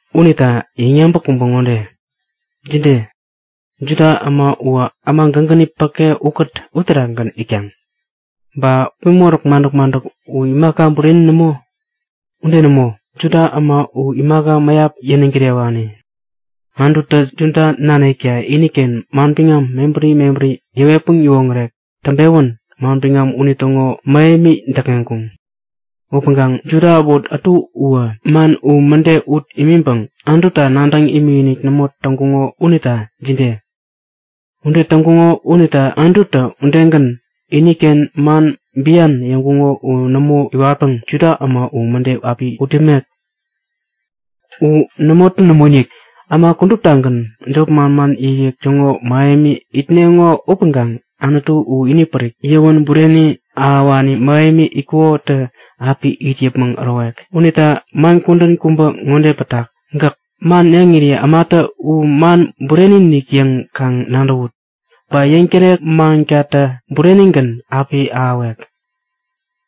Unita, yäŋyabäk kubä ŋode; Jide? Juda äma uwä äma gägäni päke ukät uterakgän itkaŋ? Ba gupi moräk madäk-madäk u imaka bureni nämo? Ude nämo! Juda äma u imaka mäyap yäniŋ kirewani. Anututä Juda nanikta iniken manbiŋam mebäri mebäri yäwetpäŋ yäwoŋärek täŋpewän manbiŋam unitäŋo mähemi däkŋeŋkuŋ. Upäŋkaŋ Juda äbot ätu uwä man u mäde ut imiŋpäŋ Anututa nadäŋ imikinik nämo täŋkuŋo unita jide? Ude täŋkuŋo unita Anututä udegän, iniken man bian yäŋkuko u nämo iwatpäŋ Juda äma u mäde api ut yämek? U nämotä nämoinik! Äma kuduptagän jop manman yäkyäk täŋo mähemi itneŋo upäŋkaŋ Anutu u inipärik, yäwän bureni ahäwani mähemi itkukotä api it yäpmäŋ ärowek. Unita man kudän kubä ŋode pätak; Gäk man yäŋiri ämatä u man bureni-inik yäŋ kaŋ nadäwut! Ba yäŋtärek mankatä burenigän api ahäwek.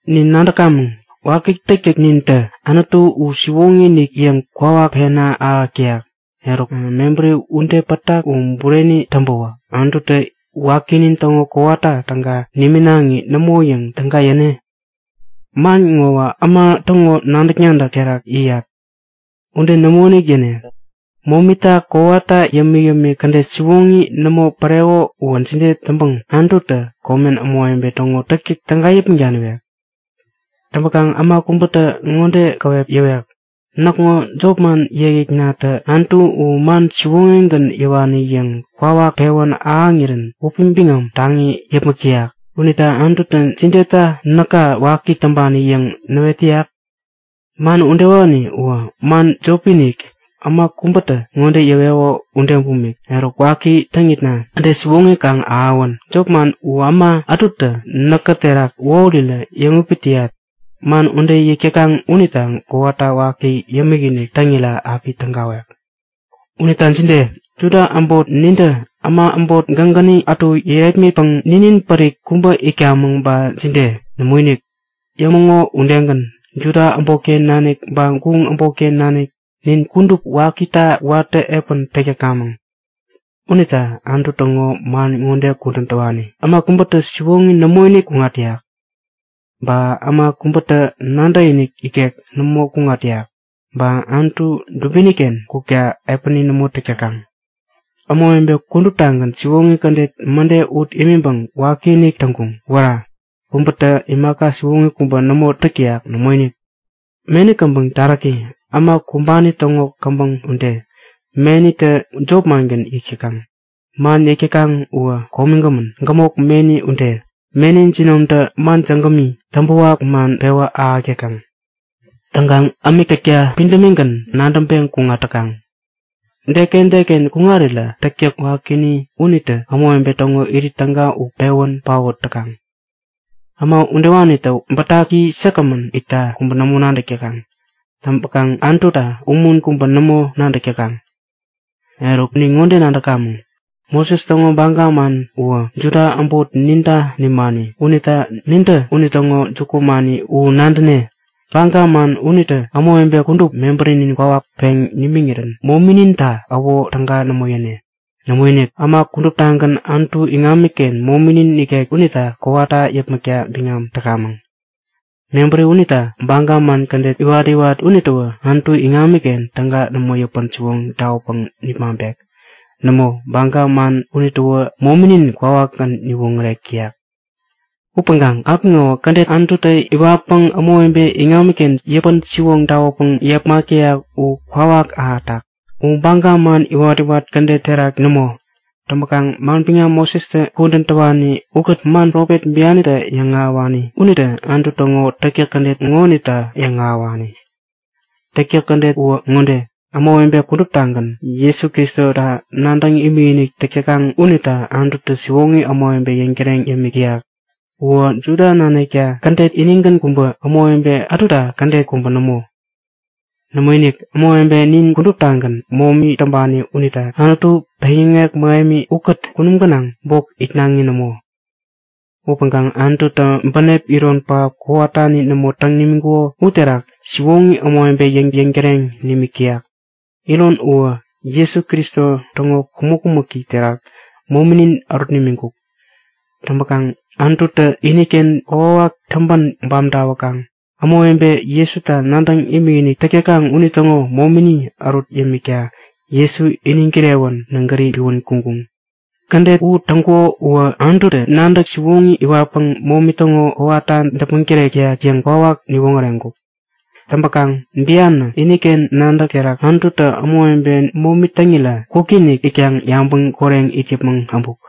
Nin nadäkamäŋ; Waki täktäknintä Anutu u siwoŋi-inik yäŋ kwawak pena ahäk täyak. Eruk, mebäri ude pätak u bureni täŋpäwä Anututä wakinin täŋo kowata täga niminaŋi nämo yäŋ täga yäne? (Man ŋowä äma täŋo nadäk-nadäk terak yäyat.) Ude nämoinik yäne! Momita kowata yämik-yämik kädet siwoŋi nämo päreko uwä jide täŋpäŋ Anututä komen ämawebe täŋo täktäk täga yäpmäŋ daniwek? Täŋpäkaŋ äma kubätä ŋode käwep yäwek; Näkŋo jopman yäkyäknatä Anutu u man siwoŋigän yäwani yäŋ kwawak pewän ahäŋirän wäpi biŋam taŋi yäpmäk täyak. Unita Anututä jideta näka waki täŋpani yäŋ näwet täyak? Man udewani uwä man jopi-inik, äma kubätä ŋode yäweko ude bumik; Eruk, waki täŋitna, kädet siwoŋi kaŋ ahäwän! Jop man u äma ätutä näkä terak wähurirä yäŋupit täyat. Man ude yäk täkaŋ unita kowata waki yäpmäkinik täŋirä api tägawek! Unita jide? Juda äbot nintä äma äbot gägäni ätu yärepmitpäŋ ninin pärik kubä itkamäŋ ba jide? Nämoinik! Yämäŋo udegän, Juda äbotken nanik ba guŋ äbotken nanik, nin kudup wakita watä epän täk täkamäŋ. Unita Anutu täŋo man ŋode kudän täwani; Äma kubätä siwoŋi nämoinik kuŋat täyak. Ba äma kubätä nadäkinik ikek nämo kuŋat täyak. Ba Anutu dubini-ken kukta epäni nämo täk täkaŋ. Ämawebe kuduptagän siwoŋi kädet mäde ut imiŋpäŋ wakinik täŋkuŋ. Wära! Kubätä imaka siwoŋi kubä nämo täk täyak. Nämoinik! Meni käbäŋ taräki, äma kumbani täŋo käbäŋ ude. Menitä jop mangän yäk täkaŋ. Man yäk täkaŋ uwä komigämän, gämok meni ude. Meni jinomtä man jägämi, täŋpäwak man pewä ahäk täkaŋ. Täŋkaŋ ämik täkta pidämigän nadäŋpeŋ kuŋat täkaŋ. Deken deken kuŋarirä täktäk wakini unitä ämawebe täŋo irit täga u pewän paot täkaŋ. Äma udewanitä bätaki säkgämän itta kubä nämo nadäk täkaŋ. Täŋpäkaŋ Anututa umun kubä nämo nadäk täkaŋ. Eruk, nin ŋode nadäkamäŋ; Moses täŋo baga man uwä Juda äbot ninta nimani unita nintä unitäŋo jukumani u nadäne. Baga man unitä ämawebe kudup mebärinin kwawak peŋ nimiŋirän momininta äwo täga nämo yäne. Nämoinik, äma kuduptagän Anutu iŋamiken mominin nikek unita kowata yäpmäkta biŋam täkamäŋ. Mebäri unita baga man kädet iwat-iwat unitäwä Anutu iŋamiken täga nämo yäpän-siwoŋ tawäpäŋ nipmaŋpek. Nämo, baga man unitäwä mominin kwawakgän niwoŋärek täyak. Upäŋkaŋ apiŋowä kädet Anututä iwatpäŋ ämawebe iŋamiken yäpän-siwoŋ tawäpäŋ yepmak täyak u kwawak ahätak. U baga man iwat-iwat kädet terak nämo. Täŋpäkaŋ manbiŋam Mosestä kudän täwani ukät man profet bianitä yäŋahäwani unitä Anutu täŋo täktäk kädet ŋonita yäŋahäwani. Täktäk kädet uwä ŋode; Ämawebe kuduptagän Jesu Kristota nadäŋ imikinik täk täkaŋ unita Anututä siwoŋi ämawebe yäŋ yäŋtäreŋ yämik täyak. Uwä Juda nanikta kädet inigän kubä, ämawebe ätuta kädet kubä nämo. Nämoinik, ämawebe nin kuduptagän momi täŋpani unita Anutu peŋyäŋek mähemi ukät kunum gänaŋ bok itnaŋi nämo. Upäŋkaŋ Anututä bänep iron pähap, kowatani nämo täŋ nimiŋkuko uterak siwoŋi ämawebe yäŋ yäŋtäreŋ nimik täyak. Iron uwä Jesu Kristo täŋo kumäk-kumäki terak mominin ärut nimiŋkuk. Täŋpäkaŋ Anututä iniken kokwawak täŋpän bam tawäkaŋ ämawebe Jesuta nadäŋ imikinik täk täkaŋ unitäŋo momini ärut yämikta Jesu iniŋ kirewän nägäri piwän kuŋkuŋ. Kädet u täŋkuko uwä Anututä nadäk siwoŋi iwatpäŋ momi täŋo kowata däpmäŋ tärek täyak yäŋ kwawak niwoŋäreŋkuk. Täŋpäkaŋ bianä iniken nadäk terak Anututä ämawebe momi täŋirä kwikinik itkaŋ yabäŋ koreŋ it yäpmäŋ äbuk.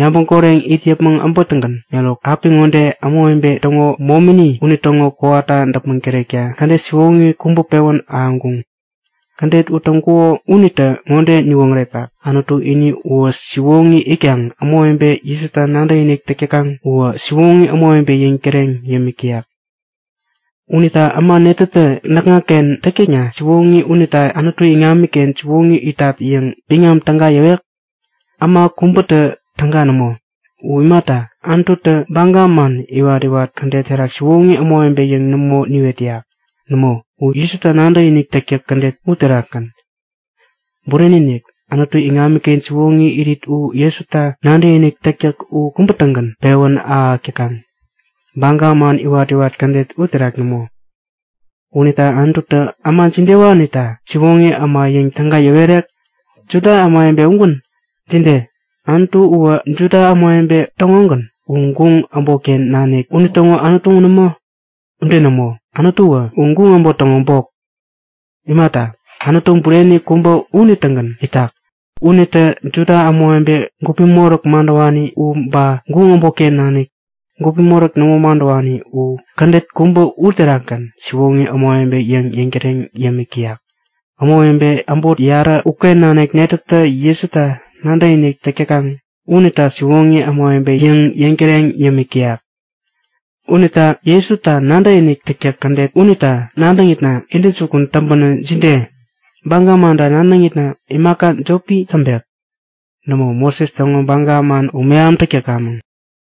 Yabäŋ koreŋ it yäpmäŋ äbätäŋgän eruk apiŋode ämawebe täŋo momini unitäŋo kowata däpmäŋ tärekta kädet siwoŋi kubä pewän ahäŋkuŋ. Kädet u täŋkuko unitä ŋode niwoŋäretak; Anutu ini uwä siwoŋi itkaŋ ämawebe Jesuta nadäkinik täk täkaŋ uwä siwoŋi ämawebe yäŋ yäŋtäreŋ yämik täyak. Unita äma netätä näkŋaken täktäkna siwoŋi unita Anutu iŋamiken siwoŋi itat yäŋ biŋam täga yäwek? Äma kubätä täga nämo. U imata, Anututä baga man iwat-iwat kädet terak siwoŋi ämawebe yäŋ nämo niwet täyak. Nämo, u Jesuta nadäkinik täktäk kädet uterakgän. Bureni-inik, Anutu iŋamiken siwoŋi irit u Jesuta nadäkinik täktäk u kubä-tägän pewän ahäk täkaŋ, baga man iwat-iwat kädet uterak nämo. Unita Anututä äma jidewanita siwoŋi äma yäŋ täga yäwerek? Juda ämawebe ugän? Jide? Anutu uwä Juda ämawebe täŋogän? U guŋ äbotken nanik unitäŋo Anutu nämo? Ude nämo! Anutuwä u guŋ äbot täŋo bok. Imata, Anutu bureni kubä unitägän itak. Unitä Juda ämawebe gupi moräk madäwani u ba guŋ äbotken nanik, gupi moräk nämo madäwani u, kädet kubä uterakgän siwoŋi ämawebe yäŋ yäŋtäreŋ yämik täyak. Ämawebe äbot yarä uken nanik netätä Jesuta nadäkinik täk täkaŋ unita siwoŋi ämawebe yäŋ yäŋtäreŋ yämik täyak. Unita Jesuta nadäkinik täktäk kädet unita nadäŋitna intäjukun täŋpänä jide? Baga manta nadäŋitna imaka jopi täŋpek? Nämo Moses täŋo baga man u mehamtäk täkamäŋ.